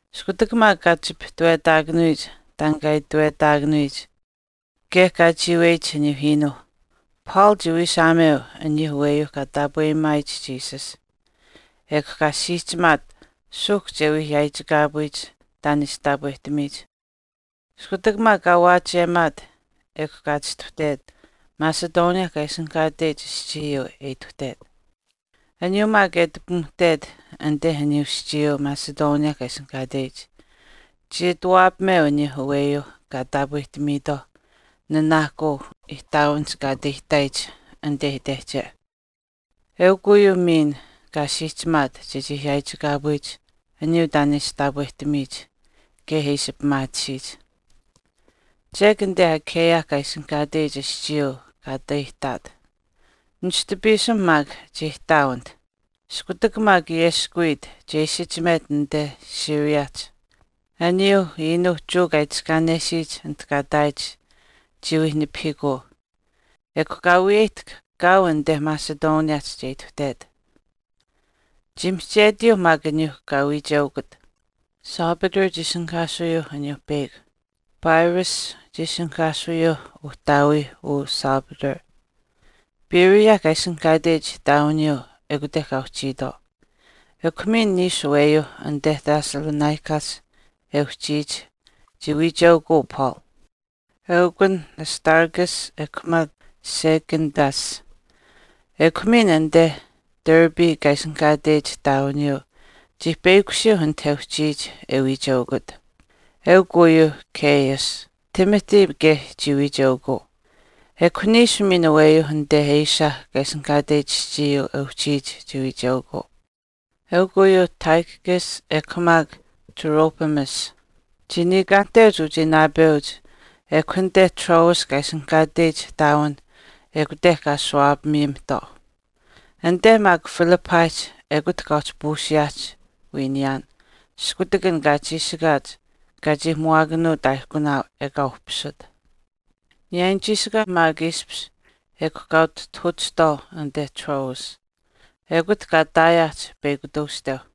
Iskutak maak kaa ati chipihtewetaakanuyich taan kaa itewetaakanuyich kaye kaa chiiweyich aniyuu iinuu Paul chii wiishaameu aniyuu aweyuuh kaa taapweyimaayich Jesus. Ekw kaa siihchimaat suuhk che wii yaaichikaapuyich taan e ishi taapwehtamiyich. Iskutak maak kaa waachiyemaat ekw kaa chistuhtet Macedonia kaa ishinihkaateyich aschiiyuu e ituhtet. Aniyuu maak e ati pimuhtet anite aniyuu aschiiyuu Macedonia kaa ishinihkaateyich chii ati waapameu aniyuu aweyuuh kaa taapwehtamiitwaau nanaahkuu ihtaawinihch kaa ati aihtaayich anite itehche. Eukw uyuu miin kaa siihchimaat chechii yaaichikaapuyich aniyuu taan e ishi taapwehtamiyich kaye e ishi pimaatisiyich. Chek anite Achaia kaa ishinihkaateyich aschiiyuu kaa ati aihtaat. Nishtu piisim maak chii ihtaau anit. Iskutak maak ayeskuwiit che isichimet anite Syriahch, aniyuu unuuh Jewa kaa itiskaanesiyich anit kaa ihtaayich chii wii nipahiikuu, ekw kaa wiyeyihtahk kaau anite Macedoniahch che ituhtet. Chii mihchetiyuu maak aniyuu kaa wiicheukut. Sopater chii ishinihkaasuyuuh aniyuu peyakw. Pyrrhus chii ishinihkaasuyuuh uhtaawii uu Sopater. Berea kaa ishinihkaateyich ihtaawiniyuu ekute kaa uhchiitwaau. Ekw miin niishu aweyuu anite Thessalonicahch e uhchiyich chii wiicheukuu Paul, eukun Aristarchus ekw maak Secundus. Ekw miin anite Derbe kaa ishinihkaateyich ihtaawiniyuu chii peyakushiyuu anit e uhchiyich e wiicheukut, eukw uyuuh Gaius. Timothy kaye chii wiicheukuu. Ekw niishu miin aweyuu anite Asia kaa ishinihkaateyich aschiiyuu e uhchiyich chii wiicheukuu, eukw uyuuh Tychicus ekw maak Trophimus. Chii niikaanihteuch uchii naapeuch ekw anite Troas kaa ishinihkaatech ihtaawin ekute kaa ashuwaapamiyimihtwaau. Anite maak Philippihch ekut kaa uhchi puusiyaahch wii niyaan iskutak an kaa chiishikaach kaa chii muwaakanuut aaihkunaau ekaa uhpisut. Niyaayinuu chiishikaau maak ishpish ekw kaa utihtahuuchihtwaau anite Troas. Ekut kaa ihtaayaahch peyakw tuushteu.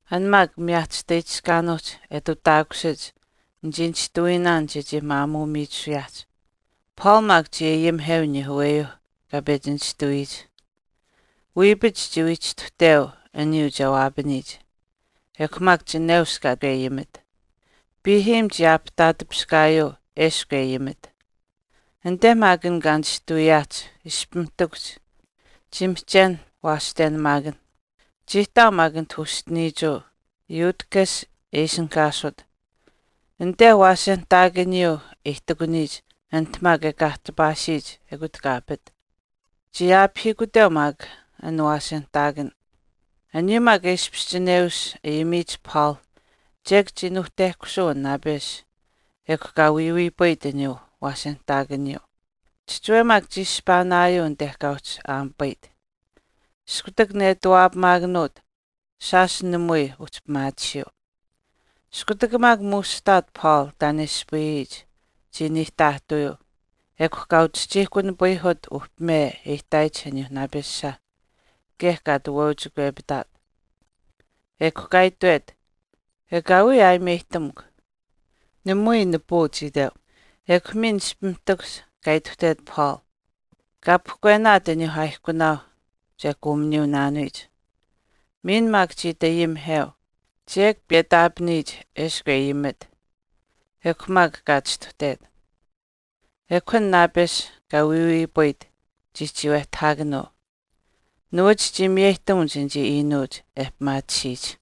An maak miyaachishtaichishkaanuuhch e ati utaakushiyich nichii nishtuwiinaan chechii maamuu miichisuyaahch. Paul maak chii ayimiheu aniyuu aweyuu kaa pechi nishtuwiyich. Wiipach chii wii chistuhteu aniyuu che waapaniyich, ekw maak chineush kaa ati ayimit. Piihiim chii aapihtaatipiskaayuu eshkw e ayimit. Anite maak an kaa nishtuwiyaahch ishpimiihtakuhch chii mihchen waashtenamaakan. Chii ihtaau maak anit uschiniichuu Eutychus e ishinihkaasut. Anite waasenihtaakaniyuu e ihtakuniyich anit maak e kaahtipaasiyich ekut kaa apit. Chii aapihiikuteyuu maak aniyuu waasenihtaakaniyuu. Aniyuu maak e ishpish chineush ayimiyich Paul chek chii nuuhtehkusuu an naapesh ekw kaa wiiwiipayit aniyuu waasenihtaakaniyuu. Chihchiwe maak chii ishpaanaayuu anite kaa uhchi aamipayit. Iskutak netawaahaakanuut, shaash namui uhchi pimaatisiyuu. Iskutak maak muushihtaat Paul taan e ispayiyich chii niihtaahtawiyuu, ekw kaa uchihchiihkunipayihut uhpime e ihtaayich aniyuu naapesha kaye kaa ati waauchikwepitaat. Ekw kaa itwet, “Ekaawii aayimeyihtamukw, namui nipuu chii itweu.” Ekw miin ishpimiihtakuhch kaa ituhtet Paul, kaa pahkwenaat aniyuu aaihkunaau che kuuminiyuunaanuyich. Miin maak chii ati ayimiheu. Chek piyetaapaniyich eshkw e ayimit, ekw maak kaa chistuhtet. Ekw an naapesh kaa wiiwiipayit chii chiiwehtahaakanuu. Nuwach chii miyeyihtamuch anichii iinuuch e pimaatisiyich.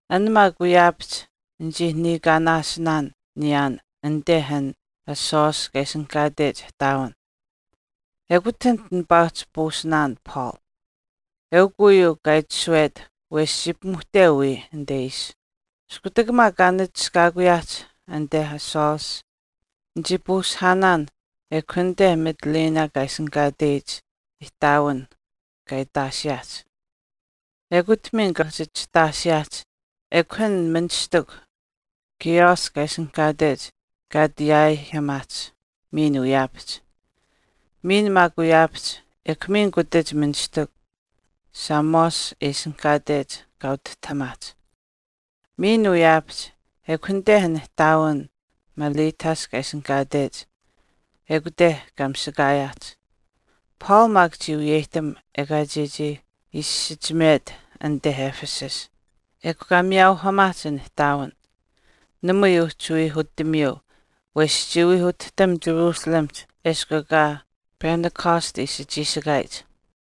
An maak wiyaapahch nichii niikaanaashinaan niyaan anite an Assos kaa ishinihkaatech ihtaawin. Ekut anit nipaa uhchi puusihaanaan Paul. Eukw uyuu kaa itashuwet wesh chii pimuhteu wiya anite ishi. Iskutak maak kaa nachishkaakuyaahch anite Assos, nichii puusihaanaan ekw anite Mitylene kaa ishinihkaatech ihtaawin kaa itaashiyaahch. Ekut miin kaa uhchi chihtaashiyaahch ekw an ministikw Chios kaa ishinihkaatech kaa ati yaaihamaahch miin wiyaapahch. Miin maak wiyaapahch ekw miin kutach ministikw Samos e ishinihkaatech kaa utihtahamaach. Miin wiyaapahch ekw anite an ihtaawin Miletus kaa ishinihkaatech ekute kaa misakaayaahch. Paul maak chii wiyeyihtam ekaa chechii isichimet anite Ephesus, ekw kaa miyaauhamaahch an ihtaawin. Namui uhchi wii utamiiu, wesh chii wii utihtam Jerusalemihch eshkw ekaa Pentecost ishi chiishikaayich.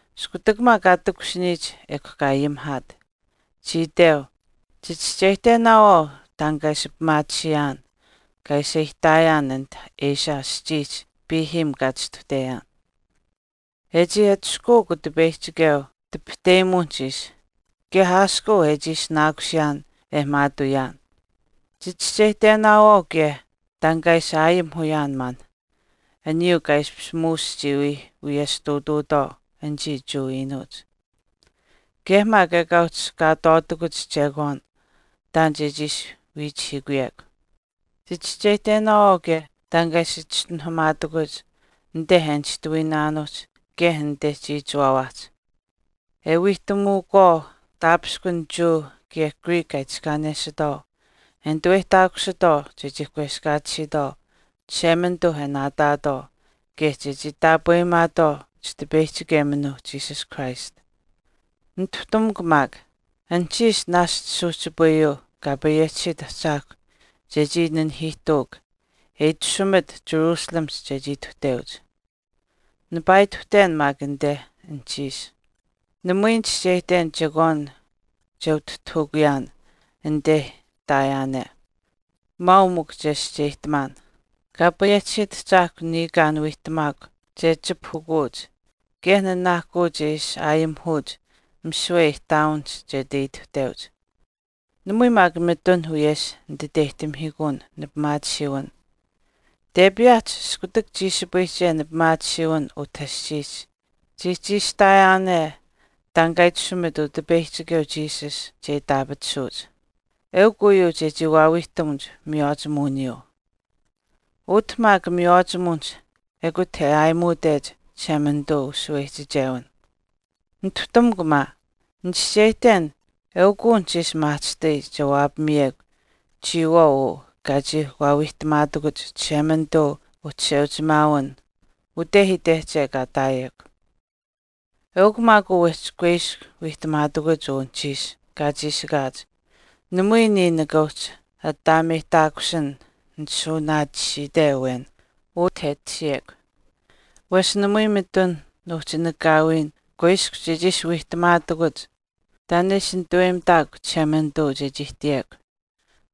Iskutak maak kaa takushiniyich ekw kaa ayimihaat. Chii iteu, “Chichischeyihtenaawaau taan kaa ishi pimaatisiyaan kaa ishpish aihtaayaan ute Asia aschiihch piihiim kaa chistuhteyaan. E chii atushkuuk Utipeyihchikeu tipahteyimuwinihch ishi kaye aaskuu e chii ishinaakusiyaan e maatuuyaan. Chichischeyihtenaawaau kaye taan kaa ishi aayimihuyaan maan aniyuu kaa ishpish muush chii wii wiyesh ihtuutuutwaau anichii Jewa iinuuch. Kaye maak ekaa uhchi kaatwaatakuch chekwaan taan chechii ishi wiichihiikuyekw. Chichischeyihtenaawaau kaye taan kaa ishi chischinuhamaatakuch anite e nishtuwiinaanuuhch kaye anite chiichiwaawaahch, e wiihtamuukwaau taapishkun Jewa kaye Greek kaa itiskaanesitwaau e nituweyihtaakusitwaau chechii kweskaatisiitwaau Chishemanituu e naataatwaau kaye chechii taapweyimaatwaau Chitipeyihchikeminuu Jesus Christ. Nituhtamukw maak, anuhchiish naashch suuhchipayuu Kaa payehchisiit Ahchaahkw chechii nanihiihtuuk e itashumit Jerusalemihch chechii ituhteuch, nipaa ituhten maak anite anuhchiish. Namui nichischeyihten chekwaan che utihtahukuyaan anite ihtaayaane. Maau mikw chescheyihtamaan, Kaa payehchisiit Ahchaahkw niniikaan wiihtamaakw che kachipahukuch kaye nanaahkuu che ishi aayimihuch misiwe ihtaawinihch che ati ituhteuch. Namui maak mitun wiyesh nititeyihtamihiikun nipimaatisiiwin tepiyaahch iskutak chiishipayihche nipimaatisiiwin utah aschiihch chii chiishitaayaane taan kaa itashumit Utipeyihchikeu Jesus che itaapatisuuch, eukw uyuu chechii waawiihtamuch miywaachimuwiniyuu. Utah maak miywaachimuwinihch ekut e aayimuuteyich Chishemanituu ushaweyihchichewin.” “Nituhtamukw maa, nichischeyihten eukw uu anuhchiish maahchishtai che waapamiyekw chiyawaau uu kaa chii waawiihtamaatakuch Chishemanituu uchisheuchimaawin ute itehche kaa ihtaayekw. Eukw maak uu wehchi kuiskw wiihtamaatakuch uu anuhchiish kaa chiishikaach namui niya nika uhchi ataameyihtaakusin nishuunaatisiite awen utah e tashiyekw. Wesh namui mitun nuuhchi nakaawiin kuiskw chechii ishi wiihtamaatakuch taan e ishi nituweyimitaakw Chishemanituu chechii ihtiyekw,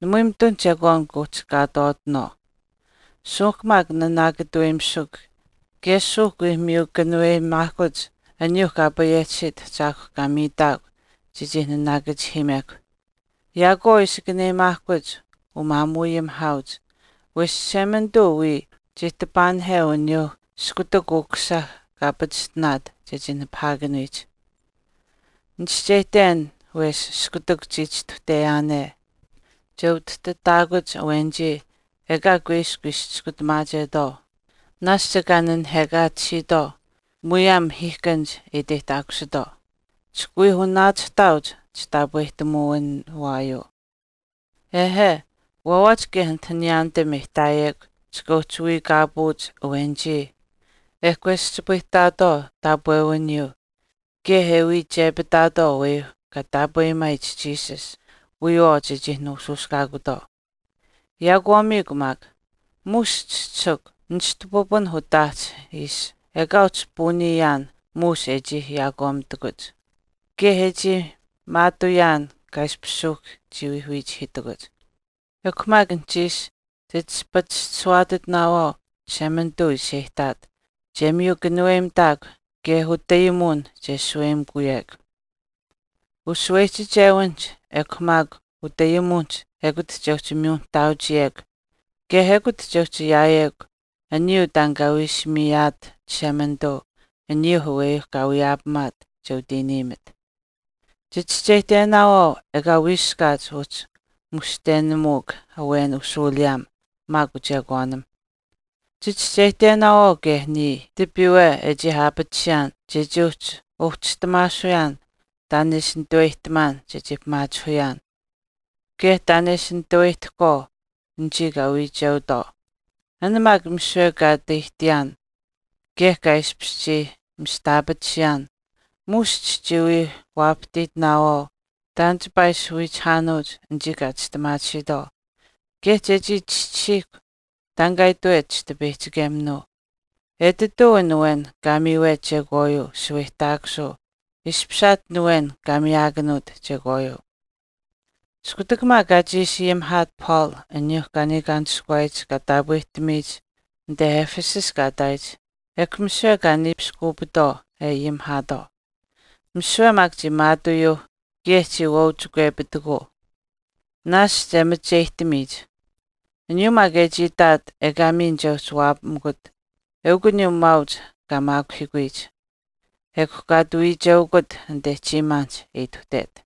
namui mitun chekwaan kuuhchi kaatwaatinaawaau. Suuhk maak naanaakatuweyimisukw kaye suuhk wii miyu kanuweyimaahkuch aniyuuh Kaa payehchisiit Ahchaahkw kaa miitaakw chechii naanaakachihiimekw. Yaakwaau ishi kanuweyimaahkuch umaamuuayimihaauch, wesh Chishemanituu wiya chii tipahahweu uyuuh iskutak Ukusisa kaa pachishtinaat chechii nipahaakanuyich. Nichischeyihten wesh iskutak chii chistuhteyaane, che utihtitaakuch awenichii ekaa kuiskw ishi chiskutamaachetwaau naashch ekaa nanihekaatisiitwaau muyaam mahiihkanich e iteyihtaakusitwaau, chika wii wanaachihtaauch chitaapwehtamuwinuwaayuu. Ehe, waawaach kaye anit niyaanitam e ihtaayekw chika uhchi wiikaapuuch awenichii e kakweschipayihtaatwaau taapwewiniyuu kaye e wii iichepitaatwaau aweyuu kaa taapweyimaayich Jesus wiyawaau chechii nuushuushkaakutwaau. Yaakwaamiikw maak, muush chischisikw nishtu pipun utaahch ishi ekaa uhchi puuniyaan muush e chii yaakwaamimitakuch, kaye e chii maatuuyaan kaa ishpish suuhk chii wii wiichihiitakuch.” “Ekw maak anuhchiish chit ishi pachishtishuwaatitinaawaau Chishemanituu ishi e ihtaat che miyu kanuweyimitaakw kaye utayimuwin che shaweyimikuwekw. Ushaweyihchichewinihch ekw maak utayimuwinihch ekut che uhchi miyu nihtaauchiyekw kaye ekut che uhchi ayaayekw aniyuu taan kaa wii ishi miyaat Chishemanituu aniyuu aweyuu kaa wiyeyimaat che utiiniimit. Chichischeyihtenaawaau ekaa wiiskaat uhchi mushtenamuuk awen ushuuliyaam maak uchekwaanim. Chichischeyihtenaawaau kaye niya tipiiwe e chii ayaapatisiyaan chechii uhchi wauhchistamaasuyaan taan e ishi nituweyihtamaan chechii pimaachihuyaan kaye taan e ishi nituweyihtahkwaau anichii kaa wiicheutwaau. An maak misiwe kaa ati aihtiyaan kaye kaa ishpish chii mistaapatisiyaan muush chichii wii waapahtiitinaawaau taan chipaa wii ishi wiichihaanuuch anichii kaa chistimaatisiitwaau kaye chechii chischisiihkw taan kaa itwet chitipeyihchikeminuu, etituu an awen kaa miiwet chekwaayuu shaweyihtaakusuu ishpishaat an awen kaa miyaakanuut chekwaayuu.” Iskutak maak kaa chiishi ayimihaat Paul aniyuu kaa niikaanishkuwaayich kaa taapwehtamiyich anite Ephesus kaa ihtaayich ekw misiwe kaa niipiskuupitwaau e ayimihaatwaau. Misiwe maak chii maatuuyuu kaye chii waauchikwepitikuu naashch e macheyihtamiyich. Aniyuu maak e chii itaat ekaa miin che uhchi waapamikut eukw uyuu maauch kaa maakuhiikuyich. Ekw kaa ati wiicheukut anite chiimaanihch e ituhtet.